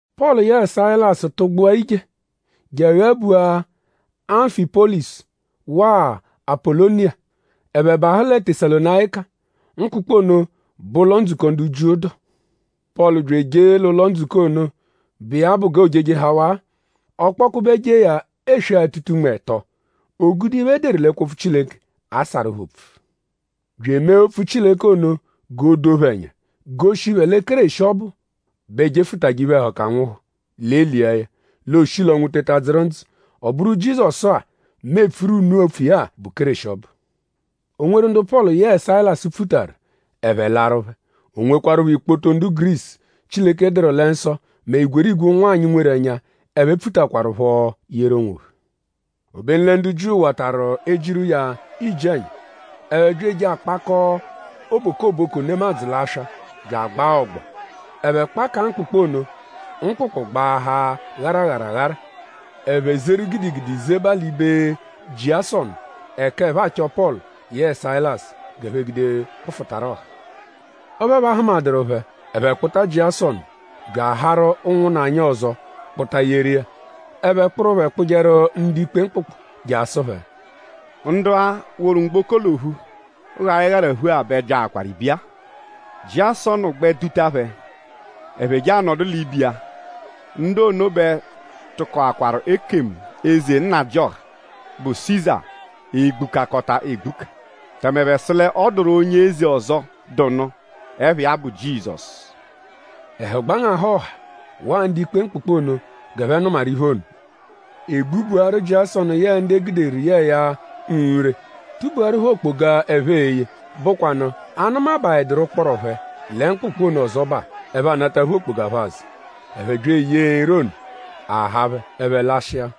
Pọlu yẹe Sayilasu tụgbua ije je aghabua Amfịpolisu waa Apoloniya. Ẹphe bahụ lẹ Tesalonayika. Mkpụkpu ono bẹ ụlo-ndzukọ ndu Jiu dụ. Pọlu bya ejee l'ụlo-ndzukọ ono, bụ iya bụ g'oojejehawa. Ọ kpọkube jee ya eswe-atụta-unme ẹto. O gude iphe, e deru l'ẹkwo-opfu Chileke asarụ phẹ opfu; bya emee opfu Chileke ono g'o doo phẹ ẹnya; goshi phẹ lẹ Kéreshi ọbu bẹ jefụtaje iphe-ẹhuka nwụhu; l'e lia ya. L'ooshi l'ọnwu teta dzụru ndzụ. Ọ bụru Jizọsu-a, mu epfuru unu opfu iya-a bụ Kéreshi ọbu. O nweru ndu Pọlu yẹe Sayilasu pfutaru; ẹphe laaru phẹ. O nwekwarụpho ikpoto ndu Gurisu, Chileke dụru lẹ nsọ mẹ igwerigwe ụnwanyi, nweru ẹnya, ẹphe pfutakwaruphọ yeru onwophẹ. Obenu lẹ ndu Jiu watarụ ejiru iya iji-ẹnya. Ẹphe bya eje akpakọo obokoboko nemadzụ l'aswa bya agbaa ọgbo. Ẹphe kpakaa mkpụkpu ono; mkpụkpu gbaahaa gharagharaghara. Ẹphe zeru gidigidi zeba l'ibe Jiasọnu ẹka ẹphe achọ Pọlu yẹe Sayilasu g'ẹphe gude kpụfutaru ọha. Ọphu ẹphe ahụmaduru phẹ; ẹphe kpụta Jiasọnu bya aharu ụnwunna anyi ọzo kpụta yeru iya. Ẹphe kpụru phẹ kpụjeru ndu-ikpe mkpụkpu je asụ phẹ: “Ndu-a, woru mgboko l'ophu gha ịgharaphu-a bẹ byaakwaru ibiya-a; Jiasọnu gbẹ duta phẹ ẹphe je anọdu l'ibe iya. Ndu ono bẹ tụkokwaru ekemu eze nnajịoha, bụ Siza egbukakọta egbuka. Tẹme ẹphe sụ l'ọ dụru onye eze ọzo, dụ nụ, ẹpha iya bụ Jizọsu.” Ẹhu gbangahụ ọha waa ndu-ikpe mkpụkpu ono g'ẹphe nụmaru iphe ono. E gbubuaru Jiasọnu yẹe ndu e guderu yẹe ya nre; tubuaru phẹ okpoga, ẹphe e-ye, bụkwanu a -nụmabaeduru ụkporo phẹ lẹ mkpụkpu ono ọzobaa; ẹphe anataphu okpoga phẹ azụ. Ẹphe bya eyee nre ono; a haa phẹ ẹphe lashịa.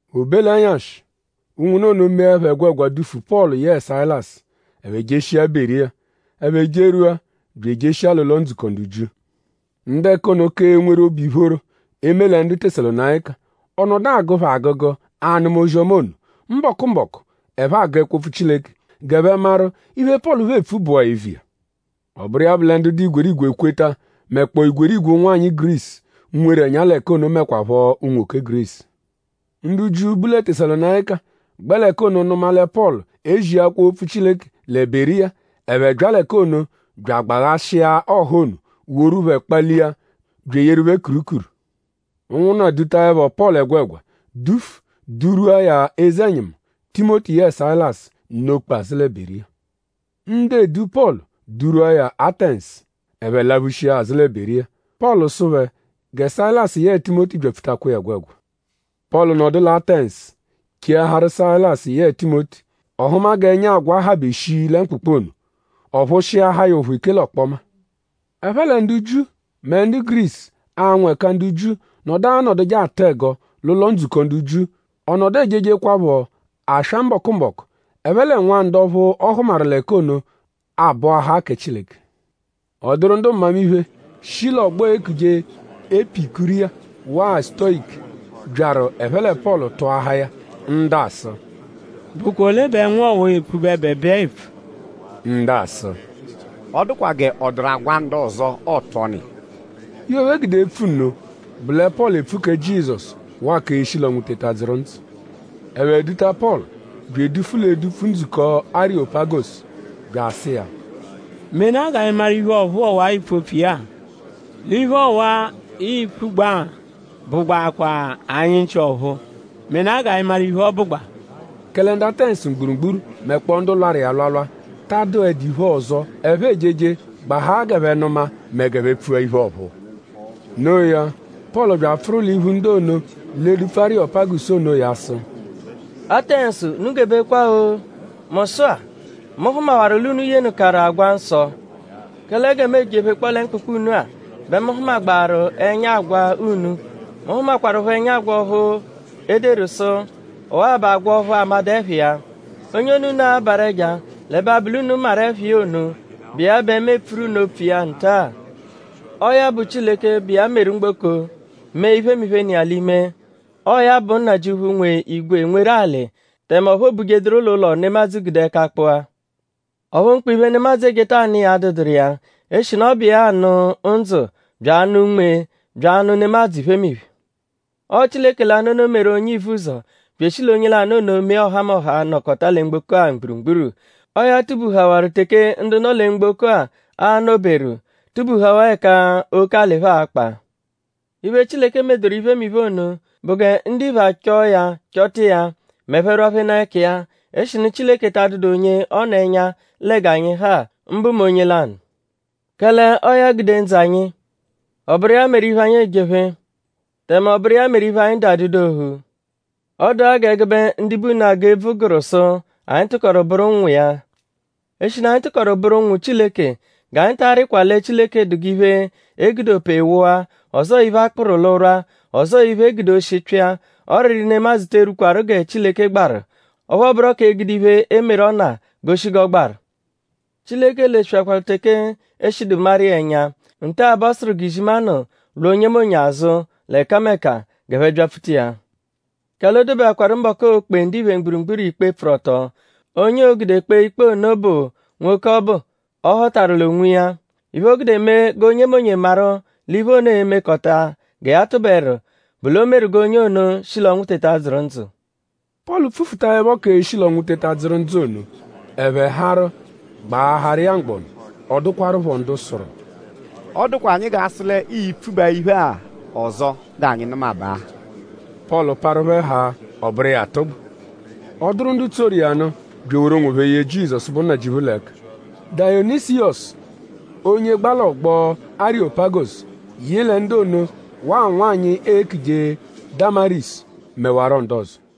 O be l'ẹnyashi; ụnwunna ono meẹpho ẹgwegwa dufu Pọlu yẹe Sayilasu; ẹphe jeshia Beriya. Ẹphe jerwua; bya ejeshia l'ụlo-ndzukọ ndu Jiu. Ndu ẹka ono ka enweru obu ìphóró e -me lẹ ndu Tesalonayika. Ọ nọdu agụ phẹ agụgu anụma ozi-ọma ono. Mbọku-mbọku ẹphe agụ ẹkwo-opfu Chileke g'ẹphe maru?iphe, Pọlu phẹ epfu bụa eviya? Ọ bụru iya bụ lẹ ndu dụ igwerigwe ekweta; mẹkpoo igwerigwe ụnwanyi Gurisu, nweru ẹnya l'ẹka ono mẹkwapho unwoke Gurisu. Ndu Jiu, bu lẹ Tesalonayika gbẹ l'ẹka ono nụma lẹ Pọlu eziakwa opfu Chileke lẹ Beriya; ẹphe bya l'ẹka ono bya agbaghashịa ọha ono; woru phẹ kpalia bya eyeru phẹ kurukuru. Ụnwunna dutaẹpho Pọlu ẹgwegwa dufu durwua ya eze-ẹnyimu. Timoti yẹe Sayilasu nọ-kpe azụ lẹ Beriya. Ndu edu Pọlu durwua ya Atẹnsu. Ẹphe laphushia azụ lẹ Beriya. Pọlu sụ phẹ gẹ Sayilasu yẹe Timoti byapfutakwa iya ẹgwegwa. Pọlu nọdu lẹ Atẹnsu cheaharu Sayilasu yẹe Timoti. Ọ hụma g'ẹnya agwa habe shii lẹ mkpụkpu ono. Ọ phụshiahaa ya ụphu ike l'ọkpoma. Ẹphe lẹ ndu Jiu mẹ ndu Gurisu, anwụ ẹka ndu Jiu nọdu anọduje atụ ẹgo l'ụlo-ndzukọ ndu Jiu. Ọ nọdu ejejekwaphọ aswa mbọku-mbọku ẹphe lẹ nwa ndu ọphu ọ hụmaru l'ẹka ono abọahaa kẹ Chileke. Ọ dụru ndu mmamiphe, shi l'ọgbo eekuje Epikuriya waa Sutoyiku, byaru ẹphe lẹ Pọlu tụahaa ya. Ndu asụ: “?Bụkwa ole bẹ nwa ọwa-a, epfu bẹebeebee-a epfu?” Ndu asụ: “Ọ dụkwa g'ọ dụru agwa ndu ọzo, ọotu ọnu iya.” Iphe, ẹphe gude epfu nno bụ lẹ Pọlu epfu kẹ Jizọsu waa k'eshi l'ọnwu teta dzụru ndzụ. Ẹphe duta Pọlu bya edufu l'edupfu, ndzukọ Arịyopagosu bya asụ iya: “Menaa g'anyi maru iphe ọ̀phúú ọwa-a, iipfu opfu iya-a. L'iphe ọwa-a, ipfugba-a bụgbakwaa anyi nchị ọ̀phúú. Menaa g'anyi maru iphe, ọ bụgbaa.” Kẹle ndu Atẹnsu mgburugburu mẹkpoo ndu lwarụ iya alwalwa ta adụedu iphe ọzo, ẹphe ejeje gbahaa g'ẹphe nụma mẹ g'ẹphe pfua iphe ọ̀phúú. No iya; Pọlu bya apfụru l'iphu ndu ono l'edupfu Arịyopagosu onoya sụ: “Atẹnsu unu gebekwa-o! Mu sụ-a; mu hụmawaru l'unu yenụkaru agwa nsọ. Kẹle gẹ mu ejephekpọo lẹ mkpụkpu unu-a bẹ mu hụmagbaaru ẹnya agwa unu. Mu hụmakwarupho ẹnya agwa ọphu e deru sụ: ‘Ọwa-a bụ k'agwa ọphu a madụ ẹpha iya’. Onye ono, unu abarụ ẹja l'ẹbe abụ l'unu maru ẹpha iya ono, bụ iya bẹ mu epfuru unu opfu iya nta-a. Ọo ya bụ Chileke, bụ iya meru mgboko mee iphemiphe, nọ iya l'ime. Ọo ya bụ Nnajịuphu, nwe igwe nweru alị; tẹme ọphu oobujeduru l'ụlo, nemadzụ gude ẹka kpụa. Ọphu mkpa iphe, nemadzụ ejeta anụ iya adụduru iya; eshinu ọ bụ iya anụ ndzụ bya anụ unme bya anụ nemadzụ iphemiphe. Ọo Chileke lanụ ono meru onye ivuzọ; bya eshi l'onye lanụ ono mee ọhamoha, nọkota lẹ mgboko-a mgburugburu. Ọo ya tubuhawaru teke ndu nọ lẹ mgboko-a a-nọ-beru; tubuhawaa ẹka oke alị phẹ a-kpa. Iphe, Chileke medoru iphemiphe ono bụ gẹ ndiphe achọo ya chọta iya m'ẹphe -rwaphenaa ẹka iya; eshinu Chileke ta adụdu onye ọ nọ ẹnya lẹ g'anyi ha; mbụ mẹ onye lanụ. Kẹle “Ọo ya gude ndzụ anyi. Ọ bụru iya meru iphe, anyi ejephe. Tẹme ọ bụru iya meru iphe, anyi dụ adụdu ophu.” Ọ dụ-a g'ẹgube ndibe unu, agụ ebvu gụru sụ: “Anyi tụkoru bụru ụnwu iya.” Eshinu anyi tụkoru bụru ụnwu Chileke; g'anyi ta arịjekwa lẹ Chileke dụ g'iphe, e gude ope wụa; ọzoo iphe, a kpụru l'ụrwa; ọzoo iphe, e gude oshi pyịa. Ọriri nemadzụ te erwukwaru gẹ Chileke gbaru; ọphu ọ bụro k'egude iphe, emeru ọna goshi g'ọ gbaru. Chileke lesweakwaru teke e shidu maru iya ẹnya. Nta-a bẹ ọ sụru g'izimanụ lwa onyemonye azụ l'ẹkameka; g'ẹphe byapfuta iya. Kẹle o dobeakwaru mbọku, oo-kpe ndiphe mgburugburu ikpe pfụru-ọto. Onye oo-gude kpee ikpe ono bụ nwoke ọbu, ọ họtaru l'onwiya. Iphe, o gude mee g'onyemonye maru l'iphe ono e-mekọta gẹ ya tụberu bụ l'o meru g'onye ono shi l'ọnwu teta dzụru ndzụ. Pọlu pfufutaẹpho k'eshi l'ọnwu teta dzụru ndzụ ono; ẹphe harụ gbaaharu iya mgbọnu. Ọ dụkwarupho ndu sụru: “Ọ dụkwa anyi g'a sụ l'ii-pfubaa iphe-a ọzo g'anyi nụmabaa.” Pọlu parụ phẹ haa; ọ bụru iya atụgbu. Ọ dụru ndu tsoru iya nụ bya eworu onwophẹ ye Jizọsu, bụ Nnajịuphu l'ẹka. Dayonisiyọsu, onye gba l'ọgbo Arịyopagosu yị lẹ ndu ono waa nwanyị, eekuje Damarisu; mẹwaro ndu ọzo.